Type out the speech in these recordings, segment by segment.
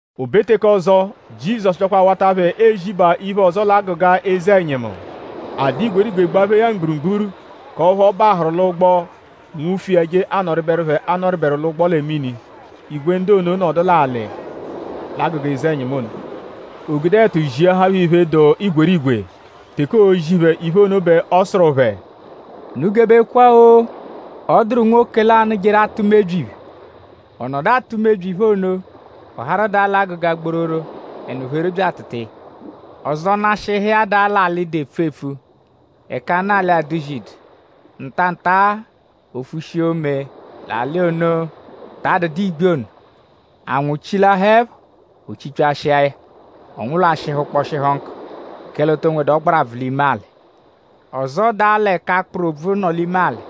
O be teke ọzo; Jizọsu byakwa awata phẹ ezibaa iphe ọzo l'agụga eze-ẹnyimu. A dụ igwerigwe gbaphee ya mgburugburu; k'ọphu ọ bahụru l'ụgbo; nwufu iya; je anọriberu phẹ anọriberu l'ụgbo lẹ mini. Igwe ndu ono nọdu l'alị l'agụga eze-ẹnyimu ono. O gude ẹtu ziahaa phẹ iphe, dụ igwerigwe. Teke oozi phẹ iphe ono bẹ ọ sụru phẹ: “Unu gebekwa-o! Ọ dụru nwoke lanụ, jeru atụ mebyi iphe. Ọ nọdu atụ mebyi iphe ono; ọ harụ daa l'agụga gbororo; ẹnu pheru bya atụtua ya. Ọzo nashịhu iya daa l'alị, dụ epfu-epfu ẹka anụ alị aduzidu; ntanta o fushia ome l'anụ alị ono, ta adụdu igbi ono. Anwụ chilahaẹpho; o chipyashia ya; ọ nwụlwashihu kpọshihu nkụ; kẹle o to nwedu ọgbarabvu l'ime alị. Ọzo daa l'ẹka akpụru obvu nọ l'ime alị.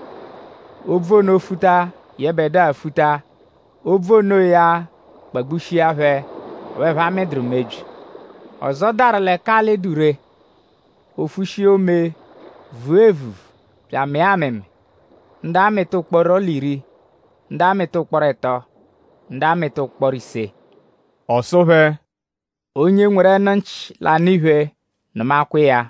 Obvu ono futa; yẹbedua futa. Obvu onoya kpagbushia phẹ; ọphu ẹphe amịduru mebyi. Ọzo daru l'ẹka alị dụ ree. O fushia ome; vua evuvu bya amịa amịmi; ndu amịta ụkporo l'iri; ndu amịta ụkporo ẹto; ndu amịta ụkporo ise.” Ọ sụ phẹ: “Onye nweru ẹnu-nchị, l'anụ iphe; nụmakwa iya!”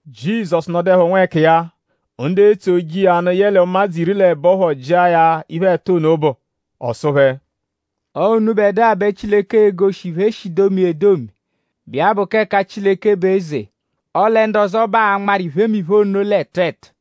Jizọsu nọduepho nwẹkiya; ndu etso iya nụ yẹle ụmadzu iri l'ẹbo phọ jịa ya iphe, ẹtu ono bụ. Ọ sụ phẹ: “Ọo unubẹdua bẹ Chileke egoshi iphe, e shi domia edomi, bụ iya bụ k'ẹka Chileke bụ eze; ọle ndu ọzo bẹ aanmaru iphemiphe ono l'ẹtu ẹtu.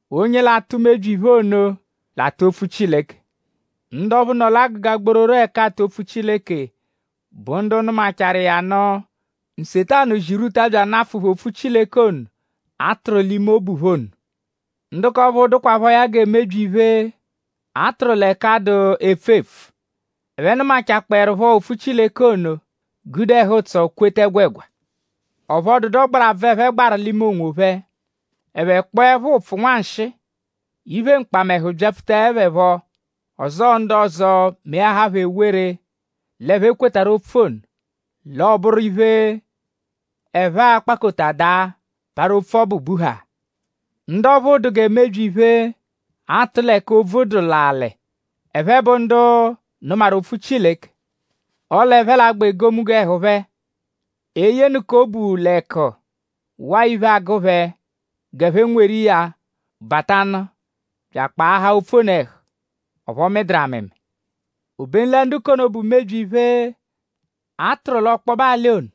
Onye l'atụ mebyi iphe ono l'atụ opfu Chileke. Ndu ọphu nọ l'agụga gbororo ẹka aatụ opfu Chileke bụ ndu nụmachaaru iya nụ; Nsetanu zirwuta bya anafụ phẹ opfu Chileke ono, a tụru l'ime obu phẹ ono. Ndu k'ọphuu dụkwaphoya gẹ mebyi iphe, a tụru l'ẹka dụ epfu-epfu. Ẹphe nụmachakpoerupho opfu Chileke ono; gude ẹhu-ụtso kweta ẹgwegwa; ọphu ọ dụdu ọgbarabvu, ẹphe gbaru l'ime onwophẹ; ẹphe kpọepho ụpfu nwanshịi; iphe mkpamẹhu byapfutaẹ phẹ phọ; ọzoo ndu ọzo melahaa phẹ ewere l'ẹphe kwetarụ opfu ono; l'ọoburu iphe, ẹphe a-kpakota daa; parụ opfu ọbu buhaa. Ndu ọphuu dụ gẹ mebyi iphe, aatụ l'ẹka obvu dụ l'alị. Ẹphe bụ ndu nụmaru opfu Chileke; ọle ẹphe l'agba egomunggo ẹhu phẹ. Eyenụka obu l'ẹku; waa iphe, agụ phẹ g'ẹphe nweru iya batanu bya akpaahaa opfu ono ẹhu. Ọphu ọ mịduru amịmi. Obenu ndu k'ono, bụ mebyi iphe, a tụru l'ọkpobe alị ono;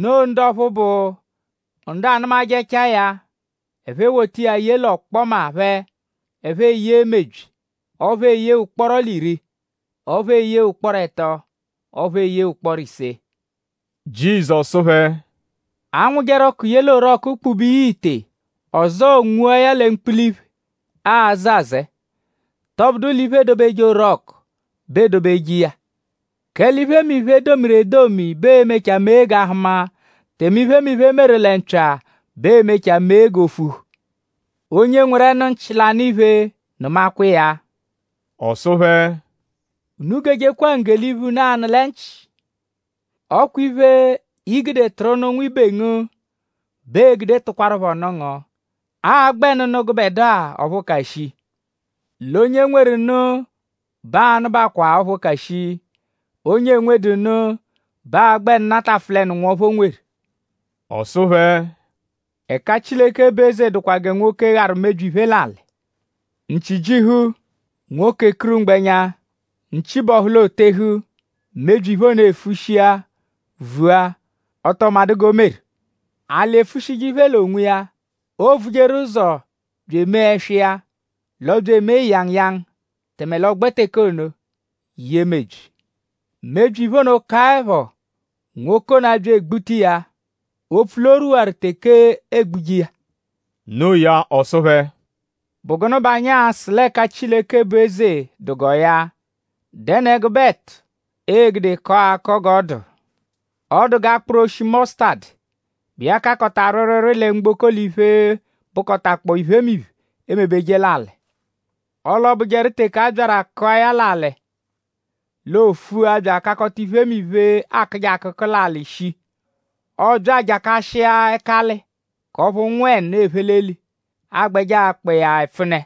noo ndu ọphu bụ ndu anụmajechaa ya; ẹphe ewota iya ye l'ọkpoma phẹ; ẹphe eyee mebyi; ọphu eyee ụkporo l'iri; ọphu eyee ụkporo ẹto; ọphu eyee ụkporo ise.” Jizọsu sụ phẹ: “?Aa-nwụjeru ọku ye l'orọku kpube iya ite; ọzoo nwua ya lẹ mkpula iphe, aazẹ azẹe??Tọbudu l'iphe, eedobeje orọku bẹ eedobeje iya? Kẹle iphemiphe, e domiru edomi bẹ ee-mechaa mee g'a hụma; tẹme iphemiphe, e meru lẹ mpya bẹ ee-mechaa mee g'o fuhu. Onye nweru ẹnu-nchị, l'anụ iphe; nụmakwa iya.” Ọ sụ phẹ: “Unu gejekwa ngge l'iphe, unu anụ lẹ nchị. Ọ kwa iphe, i gude tụru nụ nwibe ngu bẹ ee-gude tụkwarupho nụ ngu; aa-gbẹnu nụ gụbedua ọphu ka shii. L'onye nweru nụ bẹ aa-nụbakwaa ọphu ka shii. Onye enwedu nụ bẹ aa-gbẹnu natafụlenu nwọphu, o nweru.” Ọ sụ phẹ: “Ẹka Chileke bụ eze dụkwa gẹ nwoke, gharu mebyi iphe l'alị. Nchi -jihu; nwoke ekuru mgbẹnya; nchi -bọhu l'ootehu; mebyi iphe ono efushia vua; ọ tọo madụ g'o meru. Alị efushije iphe l'onwiya. Oovujeru ụzo bya emee ẹswa iya; l'ọ bya emee ịyanguyangu; tẹme l'ọogbe teke ono yee mebyi. Mebyi iphe ono -kaẹpho; nwoke ono abya egbuta iya; opfu l'o rwuwaru teke eegbuje iya.” No iya ọ sụ phẹ: “?Bụ gụnu bẹ anyi a-sụ l'ẹka Chileke bụ eze dụ g'ọ ya??Dẹnu ẹgube ẹtu, ee-gude kọo akọ g'ọ dụ? Ọ dụ g'akpụru oshi mọsutadu, bụ iya kakọta rwịirwiirwii lẹ mgboko l'iphe, bụkotakpoo iphemiphe, eemebeje l'alị. Ọle ọobujeru teke a byaru akụa ya l'alị; oofua bya akakọta iphemiphe, aakụje akụku l'alị shii. Ọobya ajakashịa ẹkali; k'ọphu ụnwu-ẹnu, ephe l'eli agbẹje akpa iya ẹpfune.”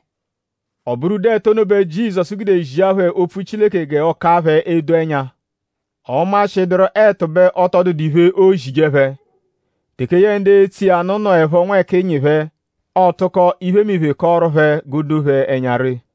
Ọ bụru ụdu ẹtu ono bẹ Jizọsu gude zia phẹ opfu Chileke g'ọo-ka phẹ edo ẹnya. Ọ -nmashịduru ẹtu bẹ ọ tọ dụdu iphe, oozije phẹ. Teke yẹe ndu etsoje iya nụ nọepho nwẹkinyi phẹ; ọotuko iphemiphe kọoru phẹ g'o doo phẹ ẹnya ree.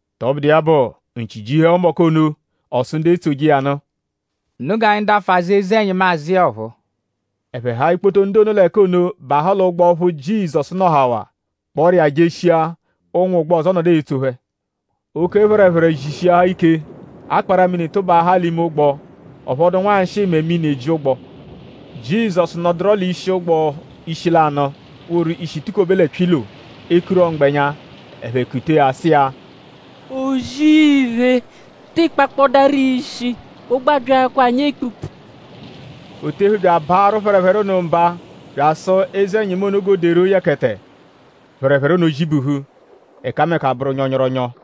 Tọbudu iya bụ; nchi jihuẹpho mbọku ono; ọ sụ ndu etsoje iya nụ: “Unu g'anyi dafụ azụ eze-ẹnyimu azụ iya ọphuu.” Ẹphe haa ikpoto ndu ono l'ẹka ono bahụ l'ụgbo ọphu Jizọsu nọhawaa; kpọru iya jeshia. Ụnwu ụgbo ọzo nọdu etso phẹ. Oke phẹrephere zishiahaa ike; akpara-mini tụbaahaa l'ime ụgbo. Ọ phọdu nwanshịi mẹ mini eji ụgbo. Jizọsu nọduro l'ishi ụgbo ishi lanụ woru ishi tukobe lẹ pyilo; ekurọ mgbẹnya. Ẹphe kutee ya sụ iya: “O-zì-iphe!?Tịi kpakpọdaro ishi? Ụgbo abyaakwaa anyi ekpukpu!” O tehu bya abaarụ phẹrephere ono mba bya asụ eze-ẹnyimu ono g'o deru yẹkete. Phẹrephere ono zibuhu; ẹkameka bụru nyọnyoronyo.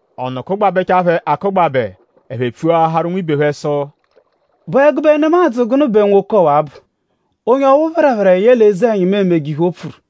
Ọnu kụgbabechaa phẹ akụgbabe. Ẹphe pfuaharu nwibe phẹ sụ: “?Bụ ẹgube nemadzụ gụnu bẹ nwoke ọwa-a bụ? Onye ọphu phẹrephere yẹle eze-ẹnyimu emeje iphe, o pfuru!”